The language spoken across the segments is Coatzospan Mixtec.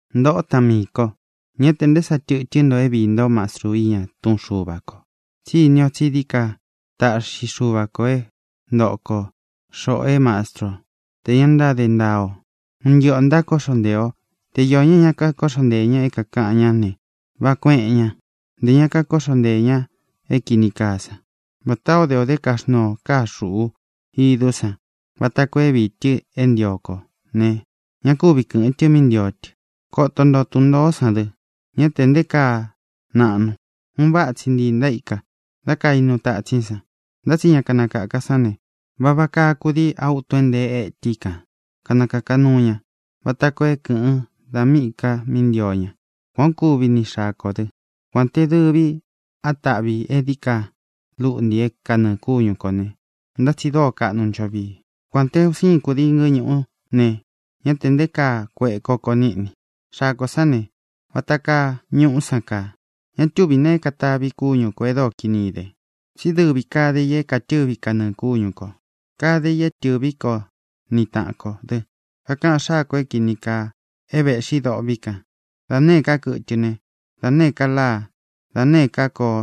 Ntōꞌó taꞌan miī ko, ñá tē nté sa tɨtɨ́n nto é viī ntó mastru iña túꞌun Xuva kō, tsí ini o tsí dií ka táꞌxi Xuva kō é ntoꞌo ko, xoꞌō é mastru ó, tē ña ntáde ntaa o. Un ntɨꞌɨ ō ntákoꞌxo ntee ō. Te iō ña é ña kakóꞌxo nteē ña é kāꞌan ñá ne, váꞌā kueꞌen ña. Ntē ña kakóꞌxo nteē ña é kīni kaa sán, vatā ó de ō dá kaxnuu ō káa xuꞌu idú san vata koo é viī tɨ é ntio kō ne, ña kúvi kɨ̄ꞌɨn tɨ mí ntio tɨ. Koto nto tun ntōó san dɨ. Ñá te nté kaa naꞌnu. Un váꞌa tsi ntii ntaíka dá kainu tatsín san. Ntá tsi ña kanakāka sán ne, vava kaa kudii á utun é ntee étɨ i kan kanakāka nuu ña vata koo é kɨ̄ꞌɨn da míꞌī ká mí ntio ña. Kuān ó kuvi ni xaa kō dɨ. Kuān té dɨvi á taꞌvi ī é dií ka lúꞌntī é kanɨɨ̄ kúñu kō ne, ntá tsi dóo kaꞌnu ncho vii. Kuān té un siin kudii ngɨ́ñūꞌú ne, ñá tē nté kaa kueꞌe koko níꞌni. Xaa kō sán ne, vata kaa ñuꞌú san kaa. Ña túvī neé ka taꞌvī kúñu kō e dóo kini ide. Tsí dɨvi kade ī é katɨ̄ví kanɨɨ̄ kúñu kō. Kade i é tɨ̄ví ko ni taꞌan kō dɨ. Kakaꞌan xáa kō é kīni kaa é vēꞌxi dôꞌvi kan. Da nēé ka kɨtɨ ne, da nēé ka láa, da nēé ka kóo,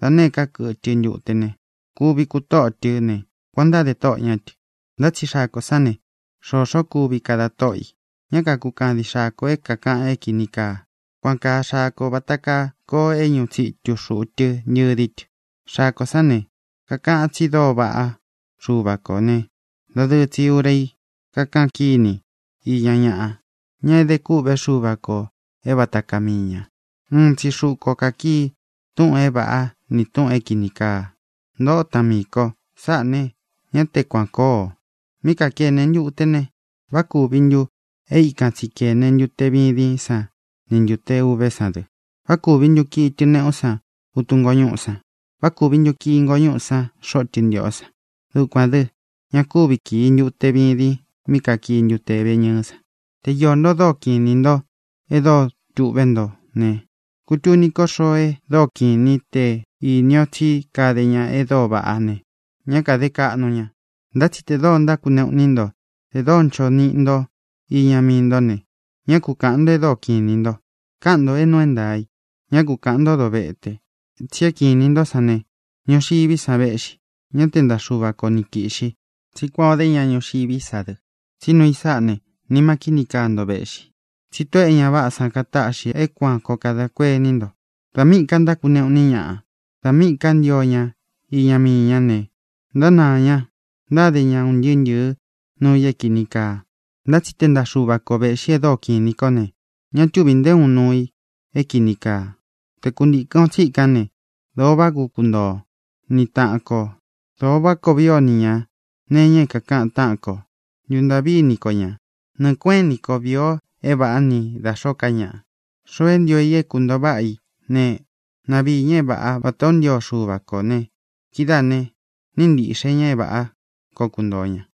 da nēé ka kɨtɨ ntute ne, kuvi kutóꞌo tɨ́ ne, kuān o ntádē tóꞌō ñá tɨ. Ntá tsi xaa kō sán ne, xoxó kuvi kada tóꞌo i. Ñá kākukadin xáa kō é kakaꞌan é kīni kaa. Kuān kaa xaa ko vata kaa koo é ñuꞌu tsitu xūꞌu tɨ ntɨdi tɨ. Xaa kō sán ne, kakaꞌan tsi dóo vaꞌá Xuva kō né, dadɨɨ tsi ūra í kakaꞌan kíni iña ñaꞌa, ña é ede kûꞌvé Xuva kō é vata kaa mii ñā. Uun tsi xuꞌu ko kākii túꞌūn é vāꞌá ni tūꞌun é kīni kaa. Ntōꞌo táꞌan miī ko, sáꞌā ne, ña te kuan kóo. Mí kākene ntute ne, ¿vá kūvi ntu é ikan tsi kēne ntute vidin sán ni ntūte uvé san dɨ? ¿Vá kūvi ntu kii tɨneꞌú san utun ngóñūꞌú san? ¿Vá kūvi ntu kii ngoñuꞌú san xoꞌo tɨntiꞌó san? Dukuān dɨ́, ña kuvi kii ntute vidin mí kakii ntute veñɨɨ́ san. Te iō nto e dóo kiꞌin inī ntó, e dóo tūꞌvé nto ne, kutuni ko xoo e dóo kiꞌin inī í tē íni o tsí kade ña e dóo vaꞌá ne, ñá kāde kaꞌnu ña. Ntá tsi tē dóo ntákuneꞌu iní nto, tē dóo ncho niꞌi nto iña mii ntó ne, ñá ku kāꞌan nto e dóo kiꞌin inī nto. Káꞌan ntō é nuu é ntaā i. Ñá ku kāꞌan ntó dovete. Tsi é kiꞌin inī ntó san ne, ñuxiví san véꞌxi, ñá te ntaꞌa Xuva ko ni kīꞌxi. Tsí kuān ó de ña ñuxiví sa dɨ. Tsí nuu i sáꞌā ne, nima kíni kaa nto véꞌxi, tsi tóꞌō e ña váꞌā san kataꞌxi é kuān koo kada kuení nto. Da míꞌī ka ntákuneꞌu iní ñaꞌa, da míꞌī ká ntio ña iña mii ña ne, ntánaā ña. Ntáde ña un ntɨɨ́ ntɨ̄ɨ́ nuu i é kīni kaa. Ntá tsi te ntaꞌa Xuva ko vēꞌxi e dóo kiꞌin inī kó ne, ña túvī nté uun nuu i é kīni kaa. Te kuntīkɨn o tsíkan ne, dōo váꞌa koo kuntoo o ni taꞌan kō, dōo váꞌa koo vii o ni ñā nee iña é kākaꞌan táꞌan kō. Ntuntāꞌví ini ko ñā. Nɨɨ̄ kueꞌén ini ko vīi o é vāꞌá ni da xōó ka ñaꞌa. Xoo é ntio i é kuntōo váꞌa i ne, na viī ña é vāꞌá vatā ó ntio Xuva kō ne, kidáā ne, níꞌi ntīꞌxe ña é vāꞌá koo kuntōo ña.